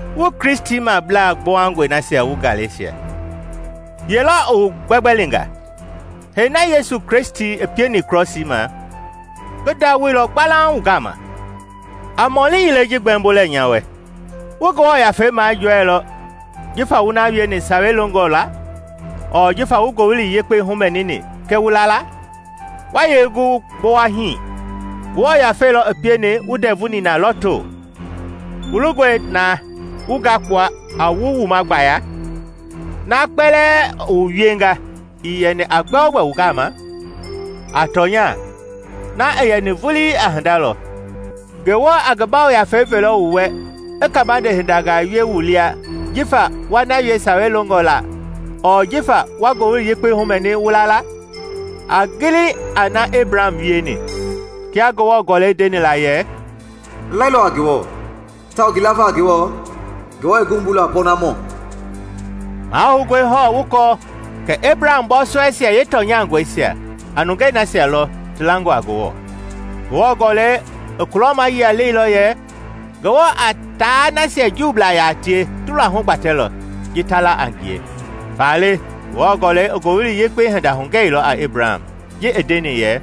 Wu Kristimablaa gbowangɔi nasia wu Galesia! Ye lɔ i wu gbɛgbɛlinga? Hee na Yesu Kristi pieni krɔsii ma, ngi nduawoilɔ gbalauŋ wu gama! A mɔli yilei ji gbɛmbo lɛ nya wɛ: wu Ngewɔ Yafei majɔɛilɔ jifa wu na wieni Sawei longɔ la ɔɔ jifa wu Ngowili Yekpei humɛnini kɛ wu laala? Wa yee gu wu gbowa hii! Ngewɔ Yafei lɔ i pieni wu ndɛvu nina lɔto; wu longɔe na wu ngakpua a wu wuma gbaya? Na kpɛlɛɛ i wu wienga ii yɛni a gbɛogbɛ wu gama? A tɔnya na i yɛni vulii a hinda lɔ. Ngewɔ a ngi Yafei velɔ wu wɛ, i kaabande hindangaa wie wu lia jifa wa na wie Sawei longɔ la ɔɔ jifa wa Ngowili Yekpei humɛni wu la la? A gili a na i Ebraham wieni; kia Ngewɔ Gɔlɛi ndeni la yɛ, “I lailɔ a Ngewɔ tawao ngi lava a Ngewɔ, Ngewɔ i ngi wumbuilɔ a pɔɔnamɔ.” Mahoungɔe hɔɔ wu kɔɔ kɛ Ebraham bɔɔsɔɛisia yeetɔnyangɔisia a nungei nasia lɔ ti langɔ a Ngewɔ. Ngewɔ Gɔlɛi i kulɔmayia leilɔ yɛ Ngewɔ a taa nasia Juublaa yaa tie luahu gbatɛlɔ ji ta la a ngie. Faale Ngewɔ Gɔlɛi i Ngowili Yekpei hinda hugɛilɔ a Ebraham ji i ndeni yɛ,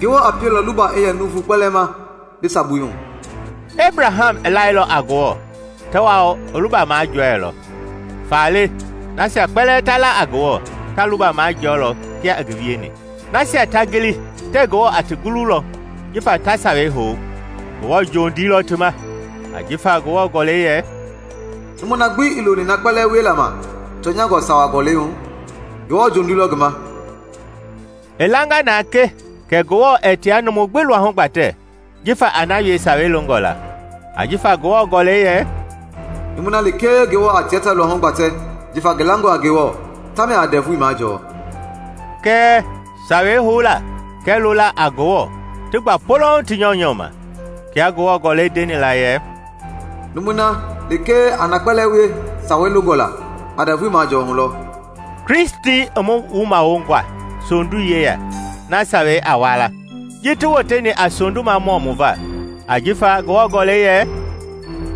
“Ngewɔ a pielɔ luba i yɛ nuuvu kpɛlɛɛ ma bi sabui hu.” Ebraham i lailɔ a Ngewɔ tawao i luba majɔɛilɔ; faale nasia kpɛlɛɛ ta la a Ngewɔ ta luba majɔɔlɔ kia i ngi wieni. Nasia ta gili tɛɛ Ngewɔ a ti gululɔ jifa ta Sawei hou, Ngewɔ jondii lɔ ti ma. Ajifa Ngewɔ Gɔlɛi yɛ, “Numu na gbi ii loni na kpɛlɛɛ wiela ma tɔnyangɔ Sawa Gɔlɛi hu, Ngewɔ jondii lɔ ngi ma!” I langa na ke kɛ Ngewɔ ɛɛ tia numu gbi luahu gbatɛ jifa a na wie Sawei longɔ la, ajifa Ngewɔ Gɔlɛi yɛ, “Numui na lekee Ngewɔ a tia ta luahu gbatɛ jifa ngi langɔ a Ngewɔ, tamia a ndɛvui majɔɔ.” Kɛɛ Sawei houla kɛɛ lola a Ngewɔ ti gba polouŋ ti nyɔunyɔ ma. Kia Ngewɔ Gɔlɛi ndeni la yɛ, “Numui na lekee a na kpɛlɛɛ wie Sawei longɔ la a ndɛvui majɔɔ hu lɔ.” Kristi i mu wumawonga sondui yeya na Sawei a wala, ji i woteni a sondumamɔ mu va; ajifa Ngewɔ Gɔlɛi yɛ,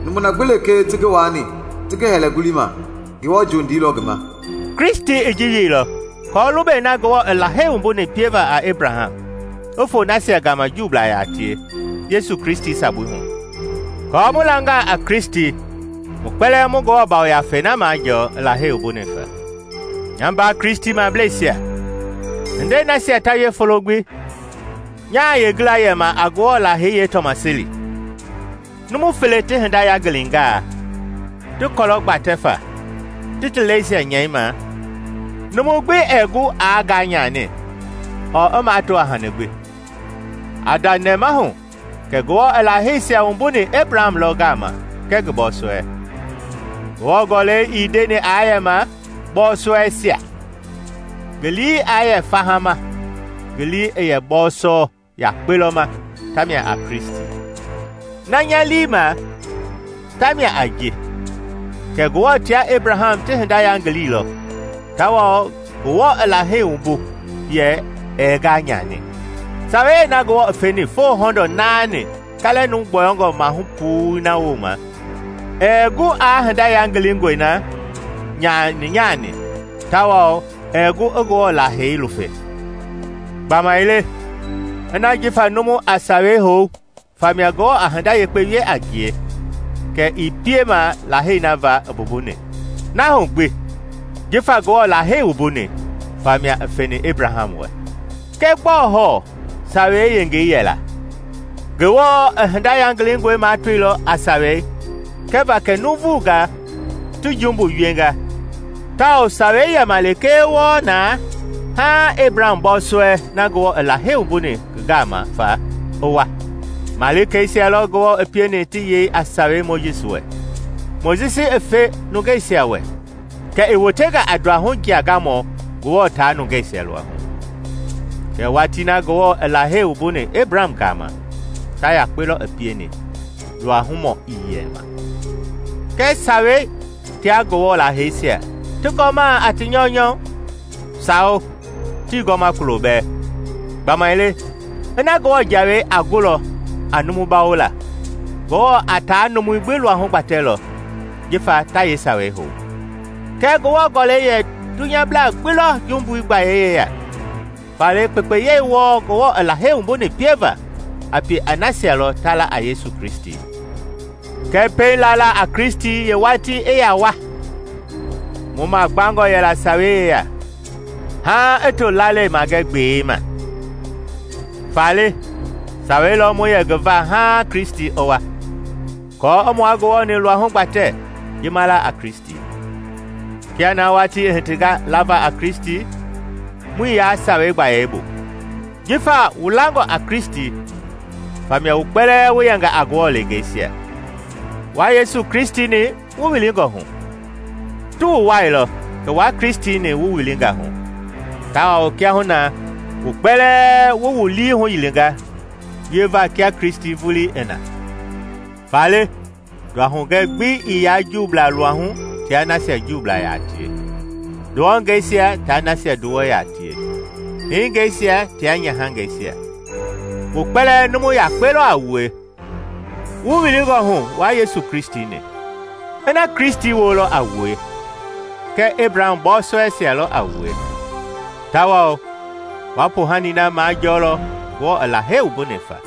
“Numu gbi lekee ti ngi waani ti ngi hɛlɛ ngulii ma, Ngewɔ jondii lɔ ngi ma.” Kristi i ji wieilɔ aako lubei na Ngewɔ i Lahei wumbuni pieva a Ebraham i foo nasia gama Juublaa yaa tie Yesu Kristi sabui hu, kɔɔ mu langaa a Kristi mu kpɛlɛɛ mu Ngewɔ Yafei na majɔɔ i Lahei wumbuni fa. Nya mbaa Kristimableisia, hindei nasia ta wie folo gbi, nyaa yeengila yɛma a Ngewɔ Lahei yeetɔmaseli. Numu fele ti hinda yangilingaa, ti kɔlɔ gbatɛ fa ti ti lɛisia nyɛi ma, numu gbi ɛɛ gu aa nganyani ɔɔ i mato a hani gbi. A nda nɛmahu kɛ Ngewɔ i ngi laheisia wumbuni Ebraham lɔ gama kɛɛ ngi bɔɔsɔɛi. Ngewɔ Gɔlɛi ii ndeni aa yɛma “bɔɔsɔɛisia” ngi lii aa yɛ faha ma, ngi lii i yɛ “bɔɔsɔ” yakpe lɔ ma tamia a Kristi. Na nya lii i ma tamia a ji; kɛ Ngewɔ tia Ebraham ti hinda yangililɔ tawao Ngewɔ i Lahei wumbu yɛ ɛɛ nganyani. Sawei na Ngewɔ i feni foo hɔndɔ naani kaalɛ numu gbɔyɔngɔ maahu puu na wooma ɛɛ gu aa hinda yangilingɔi na yanyani tawao ɛɛ gu i Ngewɔ Lahei lufe. Gbamaile ina jifa numu a Sawei hou famia Ngewɔ a hinda yekpe wie a ngie, kɛ ii piema Lahei na va i mbumbuni, na hu gbi, jifa Ngewɔ lahei wumbuni, famia i feni Ebraham wɛ. Kɛ gbɔɔ hɔɔ Sawei yengei yɛla? Ngewɔ i ngi hinda yangilingɔi matoilɔ a Sawei kɛva kɛ nuuvunga ti jumbu wienga tawao Sawei yɛma lekee wɔɔ na haaŋ Ebraham bɔɔsɔɛi na Ngewɔ i Lahei wumbuni ngi gama fa i wa. Malikeisia lɔ Ngewɔ i pieni ti yei a Sawei Mojisi wɛ, Mojisi i fe nungeisia wɛ kɛ i wotenga a nduahu jiagamɔ Ngewɔ taa nungeisia luahu. Kɛɛ watii na Ngewɔ i Lahei wumbuni Ebraham gama, ta yakpe lɔ i pieni, nduahumɔ ii yɛ ma. Kɛ Sawei tia Ngewɔ laheisia ti gɔmaa a ti nyɔunyɔ? Sawo, tii gɔma kulo bɛɛ! Gbamaile ina Ngewɔ jawei a gulɔ a numu bawola, Ngewɔ a taa numui gbi luahu gbatɛlɔ jifa ta yeesawei hou. Kɛɛ Ngewɔ Gɔlɛi yɛ dunyablaa gbi lɔ jumbui gbayei yeya; faale kpekpeyei wɔɔ Ngewɔ i Lahei wumbuni pieva, a pie a nasia lɔ ta la a Yesu Kristi. Kɛɛ pɛiŋ lala a Kristi yeewatii i yaa wa, mu magbangɔ yɛla sawei yeya, haaŋ i to lalei magɛ gbei ma. Faale Sawei lɔ mu yɛ ngi va haaŋ Kristi i wa, aako i mua Ngewɔ-ni luahu gbatɛ ji ma la a Kristi. Kia na watii i hitinga lava a Kristi, muii yaa Sawei gbayei bu. Jifa wu langɔ a Kristi famia wu kpɛlɛɛ wu yɛnga a Ngewɔ leengeisia, wua Yesu Kristi-ni wu wilingɔ hu. Ti wu wuailɔ kɛ wua Kristi-ni wu wilinga hu, tawao kiahuna na wu kpɛlɛɛ wu wu lii huyilinga wieva kia Kristi vulii i na. Faale nduahugɛ gbi ii yaa Juublaa luahu tia nasia Juublaa yaa tie, nduwɔngeisia tia nasia nduwɔ yaa tie, hingeisia tia nyahangɛisia, wu kpɛlɛɛ numu yakpe lɔ a wue, wu wilingɔ hu wua Yesu Kristi-ni. Ina Kristi woo lɔ a wue, kɛ Ebraham bɔɔsɔɛisia lɔ a wue, tawao wa poohani na majɔɔlɔ Ngewɔ i Lahei wumbuni fa.